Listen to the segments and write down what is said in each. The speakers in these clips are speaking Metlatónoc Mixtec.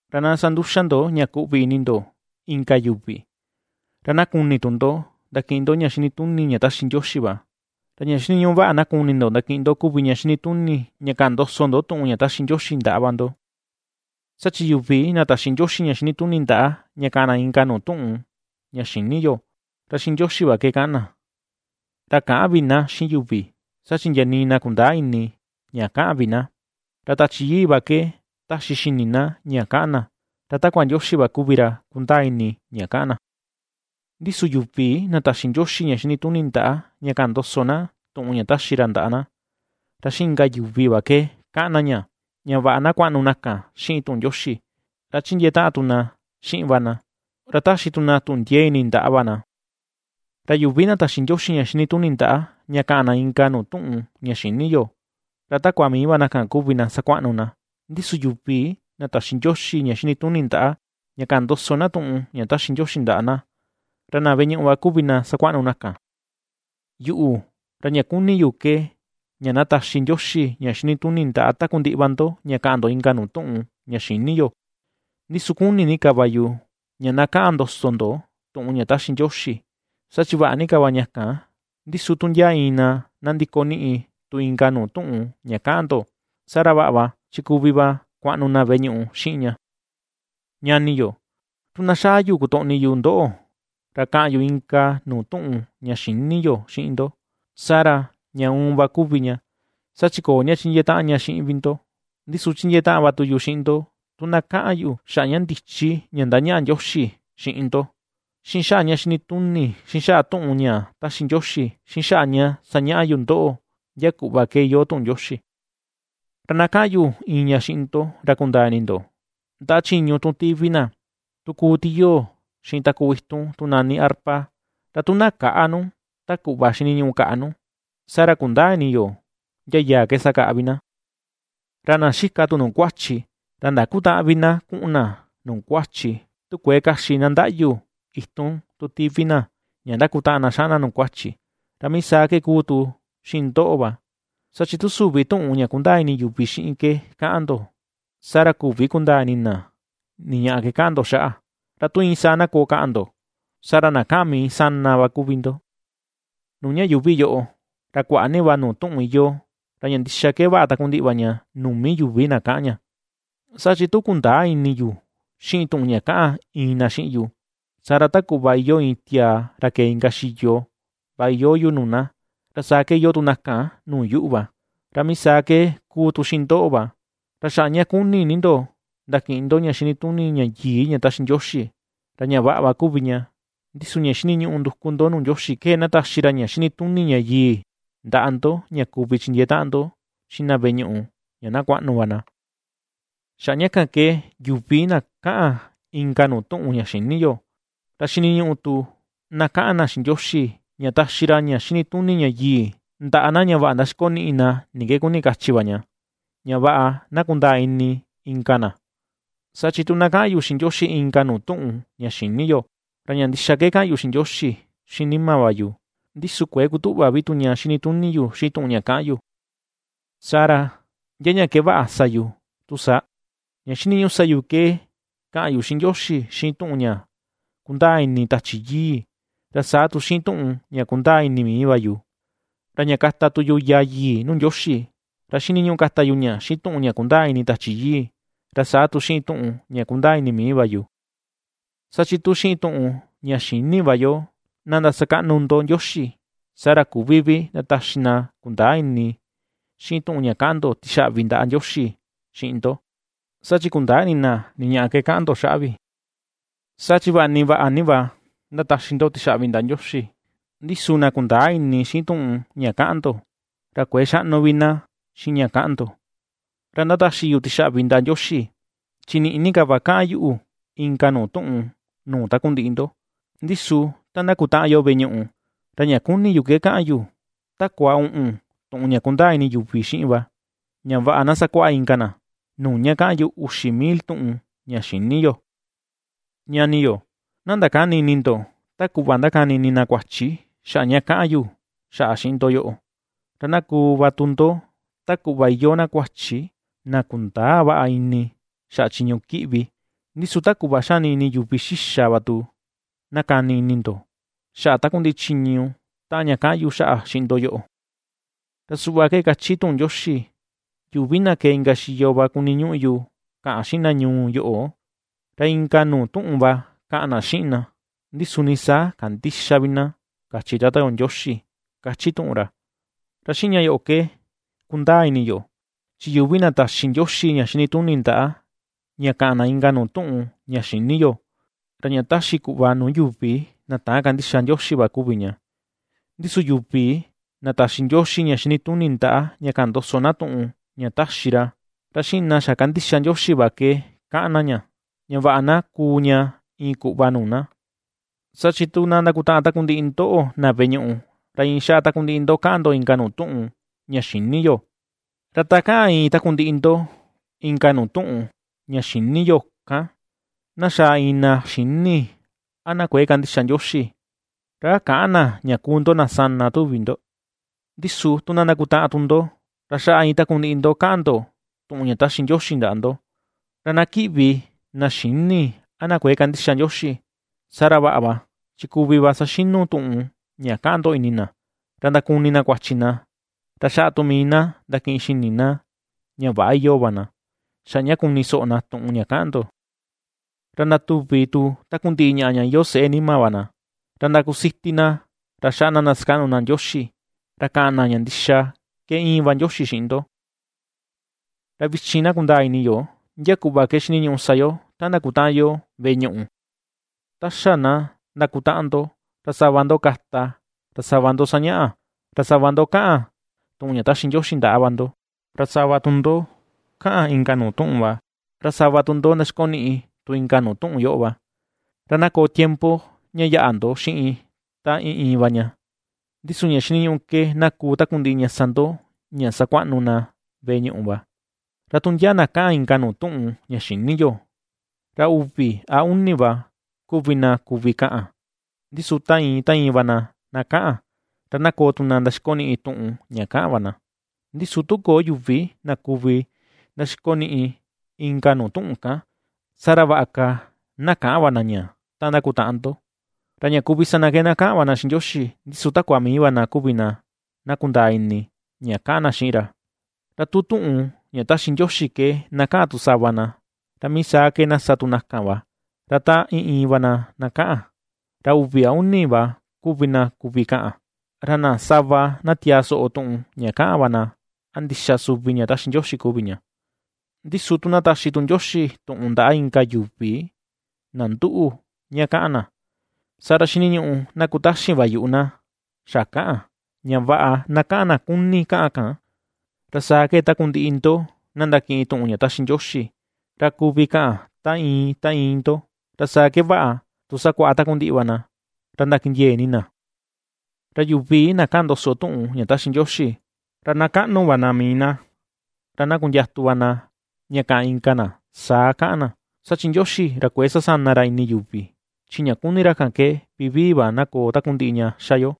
Ra na sa nduxa ndo ña kuꞌvi ini ndo inka yuvi, ra na kuni tu ndo ndakiꞌin ndo ña xinituni ña taxi Ndioxi va, ra ña xiniñuꞌu vaꞌa na kuni ndo ndakiꞌin ndo kuvi ña xinituni ña kaꞌan ndoso ndo tuꞌun ña taxi Ndioxi ndaꞌa va ndo. Saa chi yuvi na taxi Ndioxi ña xinituni ndaꞌa ña ^kaꞌan na inka nuu tuꞌun ña xïni yo, ra xiꞌin Ndioxi va ke kaꞌan na, ra käꞌan vi na xiꞌin yuvi, saa chi ndia nii na kundäa ini ña kaꞌan vi na. Ra Tachi Yii va ke ^taxi xini na ña kaꞌan na, ra takua Ndioxi va kuvi ra kundaa ini ña kaꞌan na. Ndi su yuvi na taxi Ndioxi ña xinituni ndaꞌa ña kaꞌan ndoso na tuꞌun ña ^taxi ra ndaꞌa na, ra xiꞌin inka yuvi va ke kaꞌan na ña, ña vaꞌa na kuaꞌnu na kan xiꞌin tuꞌun Ndioxi, ra ^chindiee taꞌan tu na xiꞌin va na, ra ^taxi tu na tuꞌun ndiee ini ndaꞌa va na. Ra yuvi na taxi Ndioxi ña xinituni ndaꞌa ña ^kaꞌan na inka nuu tuꞌun ña xïni yo, ra takua mii va na kuvi na ^sakuaꞌnu na, ndi su yuvi na taxi Ndioxi ña xinituni ndaꞌa ña kaꞌan ndoso na tuꞌun ña taxi ra ndaꞌa na, ra na veꞌe ñuꞌu va kuvi na sakuaꞌnu na kan. Yuꞌu, ra ña kuni yu ke ña na taxi Ndioxi ña xinituni ndaꞌa takundiꞌi va ndo ña kaꞌan ndo inka nuu tuꞌun ña xïni yo; ndi su kuni ni ka va yu ña na kaꞌan ndoso ndo tuꞌun ña taxi Ndioxi; saa chi vaꞌa ni ka va ña kan, ndi su tu ndia iin na na ndikoniꞌi tu inka nuu tuꞌun ña kaꞌan ndo, saa ra, vaꞌa va chi kuvi va kuaꞌnu na veꞌe ñuꞌu xiꞌin ña. Ñani yo, tu na xaa yu kutoꞌni yu ndoꞌo, ra kaꞌan yu inka nuu tuꞌun ña xïni yo xiꞌin ndo, saa ra, ña uun va kuvi ña, saa chi köo ña chindiee taꞌan ña xiꞌin vi ndo. Ndi su chindiee taꞌan va tu yu xiꞌin ndo, tu na kaꞌan yu xaꞌa ña ndichi ña ^ndañaꞌa Ndioxi xiꞌin ndo, xiꞌin xaꞌa ña xinituni, xiꞌin xaꞌa tuꞌun ña ^taxi Ndioxi, xiꞌin xaꞌa ña sañaꞌa yu ndoꞌo ndia kuꞌva ke iyoo tuꞌun Ndioxi. Ra na kaꞌan yu iin ña xiꞌin ndo ra kundaa ini ndo, ndaꞌa chiñu tun tivi na, ta kuu tiyoo xiꞌin takuu itun tu nani arpa, ra tu na käꞌa nu ta kuꞌva xiniñuꞌu kaꞌa nu, saa ra, kundäa ini yo ndia yaa ke sakaꞌa vi na. Ra na xika tu nuu kuachi, ra ndakutäꞌan vi na kuꞌun na nuu kuachi, tu kuëe kaxi na ndaꞌyu itun tu tivi na ña ndakutaꞌan na xaꞌan na nuu kuachi, ra mii saa ke ^kuu tu xiꞌin ndoꞌo va: saa chi tu süvi tuꞌun ña kundaa ini yuvi xiꞌin ke kaꞌan ndo, saa ra küvi vi kundaa ini na ni ñaꞌa ke kaꞌan ndo xaꞌa. ¡Ra tu iin saa na koo kaꞌan ndo, saa ra, na kaꞌan mii sana va kuvi ndo! Nuu ña yuuvi yoꞌo ra kuaꞌa ni va nuu tuꞌun iyoo, ra ña ndixa ke vaꞌa takundiꞌi va ña nuu mii yuvi na kaꞌan ña. Saa chi tu kundäa ini yu xiꞌin tuꞌun ña kaꞌan iin na xiꞌin yu, saa ra ta kuꞌva iyoo iin tiaa ra kee inka xiyo va iyoo yu nuu na, ra saa ke iyoo tu na kan nuu yuꞌu va. Ra mii saa ke ^kuu tu xiꞌin ndoꞌo va, ra xaꞌa ña kuni ni ndo ndakiꞌin ndo ña xinituni ña yii ña taxi Ndioxi, ra ña vaꞌa va kuvi ña, ndi su ña xiniñuꞌu nduku ndo nuu Ndioxi ke, na taxi ra ña xinituni ña yii ndaꞌa ndo ña kuvi chindiee taꞌan ndo xiꞌin na veꞌe ñuꞌu ña na kuaꞌnu va na. Xaꞌa ña kan ke yuvi na kaꞌan inka nuu tuꞌun ña xïni yo, ra xiniñuꞌu tu na kaꞌan na xiꞌin Ndioxi, ña taxi ra ña xinituni ña yii ndaꞌa na ña vaꞌa ndaxikoniꞌi na ni ke kuni kachi va ña, ña vaꞌa na kundaa ini inka na. Saa chi tu na kaꞌan yu xiꞌin Ndioxi inka nuu tuꞌun ña xïni yo; ra ña ndixa ke kaꞌan yu xiꞌin Ndioxi xiꞌin nima va yu, ndi su kuëe kutuꞌva vi tu ña xinituni yu xiꞌin tuꞌun ña kaꞌan yu. Saa ra, ¿ndia ña ke vaꞌa sa yu tu saa? Ña xiniñuꞌu sa yu ke kaꞌan yu xiꞌin Ndioxi xiꞌin tuꞌun ña kundaa ini Tachi Yii, ra saa tu xiꞌin tuꞌun ña kundaa ini mii va yu. Ra ña kata tu yu yaa yii nuu Ndioxi, ra xiniñuꞌu kata yu ña xiꞌin tuꞌun ña kundaa ini Tachi Yii, ra saa tu xiꞌin tuꞌun ña kundaa ini mii va yu. Saa chi tu xiꞌin tuꞌun ña xïni va yo na ndasakaꞌnu ndo Ndioxi, saa ra küvi vi ndataxi na kundäa ini xiꞌin tuꞌun ña kaꞌan ndo tixaꞌvi ndaꞌa Ndioxi xiꞌin ndo, saa chi kundäa ini na ni ñaꞌa ke kaꞌan ndo xaꞌa vi. Saa chi vaꞌa ni vaꞌa ni va ndataxi ndo tixaꞌvi ndaꞌa Ndioxi, ndi su na kundäa ini xiꞌin tuꞌun ña kaꞌan ndo, ra kuëe xaꞌnu vi na xiꞌin ña kaꞌan ndo. Ra ndataxi yu tixaꞌvi ndaꞌa Ndioxi, chi niꞌi ni ka va kaꞌan yuꞌu inka nuu tuꞌun nuu takundiꞌi ndo; ndi su ta ndakutaꞌan yo veꞌe ñuꞌu, ra ña kuni yu ke kaꞌan yu, takua uꞌun tuꞌun ña kundaa ini yuvi xiꞌin va, ña vaꞌa na sakuaꞌa inka na, nuu ña kaꞌan yu uxi mil tuꞌun ña xïni yo. Ñani yo, na ndakäni ini ndo ta kuꞌva ndakani ini na kuachi xaꞌa ña kaꞌan yu xaꞌa xiꞌin ndo yoꞌo. Ra na kuu va tu ndo ta kuꞌva iyoo na kuachi na kundäa vaꞌa ini xaꞌa chiñu kiꞌvi, ndi su ta kuꞌva xani ini yuvi xixa va tu na kani ini ndo xaꞌa takundiꞌi chiñu taꞌan ña kaꞌan yu xaꞌa xiꞌin ndo yoꞌo. Ra suꞌva ke kachi tuꞌun Ndioxi: “Yuvi na kee inka xiyo va kuniñuꞌu yu kaꞌan xiꞌin na ñuu yoꞌo, ra inka nuu tuꞌun va kaꞌan na xiꞌin na, ndi su nii saa kandïxa vi na, kachi Tata yo Ndioxi”, ^kachi tuꞌun ra. Ra xiꞌin ña yoꞌo ke kundaa ini yo, chi yuvi na taxi Ndioxi ña xinituni ndaꞌa ña kaꞌan na inka nuu tuꞌun ña xïni yo, ra ña taxi kuꞌva nuu yuvi na täan kandixa Ndioxi va kuvi ña. Ndi su yuvi na taxi tu Ndioxi ña xinituni ndaꞌa ña kaꞌan ndoso na tuꞌun ña taxi ra, ra xiꞌin na xa kandixa Ndioxi va ke kaꞌan na ña, ña vaꞌa na kuu ña iin kuꞌva nuu na. Saa chi tu na ndakutaꞌan takundiꞌi ndoꞌo na veꞌe ñuꞌu, ra iin xaꞌa takundiꞌi ndo kaꞌan ndo inka nuu tuꞌun ña xïni yo, ra ta kaꞌan iin takundiꞌi ndo inka nuu tuꞌun ña xïni yo kan, na xaa iin na xïni a na kuëe kandixa Ndioxi, ¿ra a käꞌan na ña kuu ndo na sana, tuvi ndo? Ndi su tu na ndakutaꞌan tu ndo, ra xaꞌa iin takundiꞌi ndo kaꞌan ndo tuꞌun ña taxi Ndioxi ndaꞌa ndo, ra na kiꞌvi iin na xïni a na kuëe kandixa Ndioxi, saa ra vaꞌa va, chi kuvi va saxinu tuꞌun ña ^kaꞌan ndo ini na, ra ndakuni na kuachi na, ra xaꞌa tu mii na ndakiꞌin xini na ña väꞌa iyoo va na, xaꞌa ña kuni soꞌo na tuꞌun ña ^kaꞌan ndo. Ra ndatuvi tu takundiꞌi ña iyoo seꞌe nima va na, ra ndakusiti na ra xaꞌa na ndasakaꞌnu na Ndioxi, ra kaꞌan na ña ndixa ke íin va Ndioxi xiꞌin ndo. Ra vichin na kundaa ini yo ndia kuꞌva ke xiniñuꞌu sa yo ta ndakutaꞌan yo veꞌe ñuꞌu: Ta xa na ndakutaꞌan ndo, ra sava ndo kata, sava ndo sañaꞌa, sava ndo kaꞌan tuꞌun ña taxi Ndioxi ndaꞌa va ndo, ra sava tu ndo kaꞌan inka nuu tuꞌun va, ra sava tu ndo ndaxikoniꞌi tu inka nuu tuꞌun yoꞌo va. Ra na koo tiempo ña yaꞌa ndo xiꞌin ta iin iin va ña, ndi su ña xiniñuꞌu ke na kuu takundiꞌi ña sa ndo ña sakuaꞌnu na veꞌe ñuꞌu va. Ra tu ndia na na kaꞌan inka nuu tuꞌun ña xïni yo, ra uvi a uni va kuvi na kuvi kaꞌan, ndi su ta iin ta iin va na na kaꞌan, ra na koo tu na ndaxikoniꞌi tuꞌun ña kaꞌan va na. Ndi su tu köo yuvi na kuvi ndaxikoniꞌi inka nuu tuꞌun kan, saa ra vaꞌa ka na käꞌan va na ña ta ndakutaꞌan ndo, ra ña kuvi sa na ke na kaꞌan va na xiꞌin Ndioxi, ndi su takua mii va na kuvi na na kundaa ini ña kaꞌan na xiꞌin ra. Ra tu tuꞌun ña ^taxi Ndioxi ke na kaꞌan tu sava na, ra mii saa ke na sa tu na kan va, ra ta iin iin va na kaꞌan, ra uvi a uni va kuvi na kuvi kaꞌan, ra na sava na tiaa soꞌo tuꞌun ña kaꞌan va na a ndixa suvi ña taxi Ndioxi kuvi ña. Ndi su tu na taxi tu Ndioxi tuꞌun ndaꞌa inka yuvi na nduꞌu ña kaꞌan na, saa ra xiniñuꞌu na kutaxin va yuꞌu na xa kaꞌan, ña vaꞌa na kaꞌan na kuni kaꞌan kan. Ra saa ke takundiꞌi ndoꞌo na ndakiꞌin tuꞌun ña ^taxi Ndioxi, ra kuvi kaꞌan ta iin ta iin ndo, ra saa ke vaꞌa tu sakuaꞌa takundiꞌi va na, ra ndakindiee ini na. Ra yuvi na kaꞌan ndoso tuꞌun ña ^taxi Ndioxi, ra na kaꞌnu va na mii na, ra na kundiatu va na ña kaꞌan inka na saa kaꞌan na. Saa chi Ndioxi ra kuëe sasana ra ini yuvi, chi ña kuni ra kan ke vivii va, na koo takundiꞌi ña xa yo.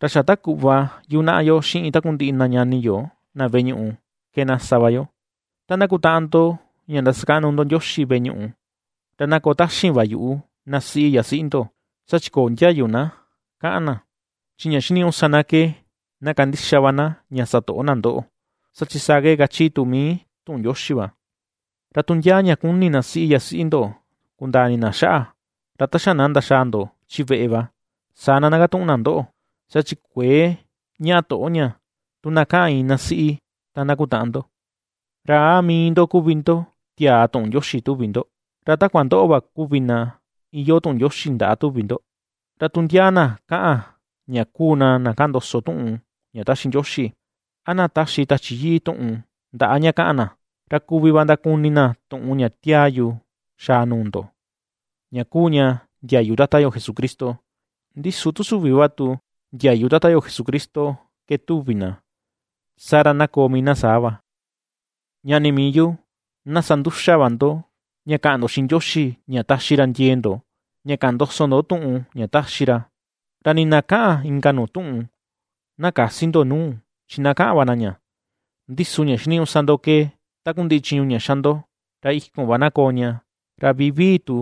Ra xa ta kuꞌva yunaꞌa yo xiꞌin takundiꞌi na ñani yo na veꞌe ñuꞌu ke na sa va yo, ta ndakutaꞌan ndo ña ndasakaꞌnu ndo Ndioxi veꞌe ñuꞌu, ra na koo taxin va yuꞌu na siꞌi yasiꞌi ndo, saa chi köo ndiayu na kaꞌan na, chi ña xiniñuꞌu sa na ke na kandixa va na ña sa toꞌo na ndoꞌo, saa chi saa kachi tu mii tuꞌun Ndioxi va. Ra tu ndia ña kuni na siꞌi yasiꞌi ndo kundaa ini na xaꞌa, ra ta xa na ndaxaa ndo chi veꞌe va, saa na ndakatuꞌun na ndoꞌo; saa chi kuëe ñaꞌa toꞌo ña tu na kaꞌan iin na siꞌi ta ndakutaꞌan ndo. ¿Ra a mii ndo kuvi na tiaa tuꞌun Ndioxi tuvi ndo, ra a takua ndoꞌo va kuvi tu na iyoo tuꞌun Ndioxi ndaꞌa tuvi ndo? Ra tu ndia na kaꞌan ña kuu na na kaꞌan ndoso tuꞌun ña ^taxi Ndioxi, a na ^taxi Tachi Yii tuꞌun ndaꞌa ña kaꞌan na, ra kuvi va ndakuni na tuꞌun ña ^tiaa yu xaa nuu ndo, ña kuu ña ndiayu Tata yo Jesucristo. Ndi su tu süvi va tu ndiayu Tata yo Jesucristo ke tuvi na, saa ra na koo mii na saa va. Ñani mii yu, na sa nduxa va ndo ña kaꞌan ndo xiꞌin Ndioxi ña taxi ra ndiee ndo ña kaꞌan ndoso ndo tuꞌun ña taxi ra, ra nii na kaꞌan inka nuu tuꞌun, na käsi ndo nuu, chi na kaꞌan va na ña; ndi su ña xiniñuꞌu sa ndo ke takundiꞌi chiñu ña xa ndo, ra ikun va na koo ña, ra vivii tu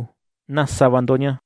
na sa va ndo ña.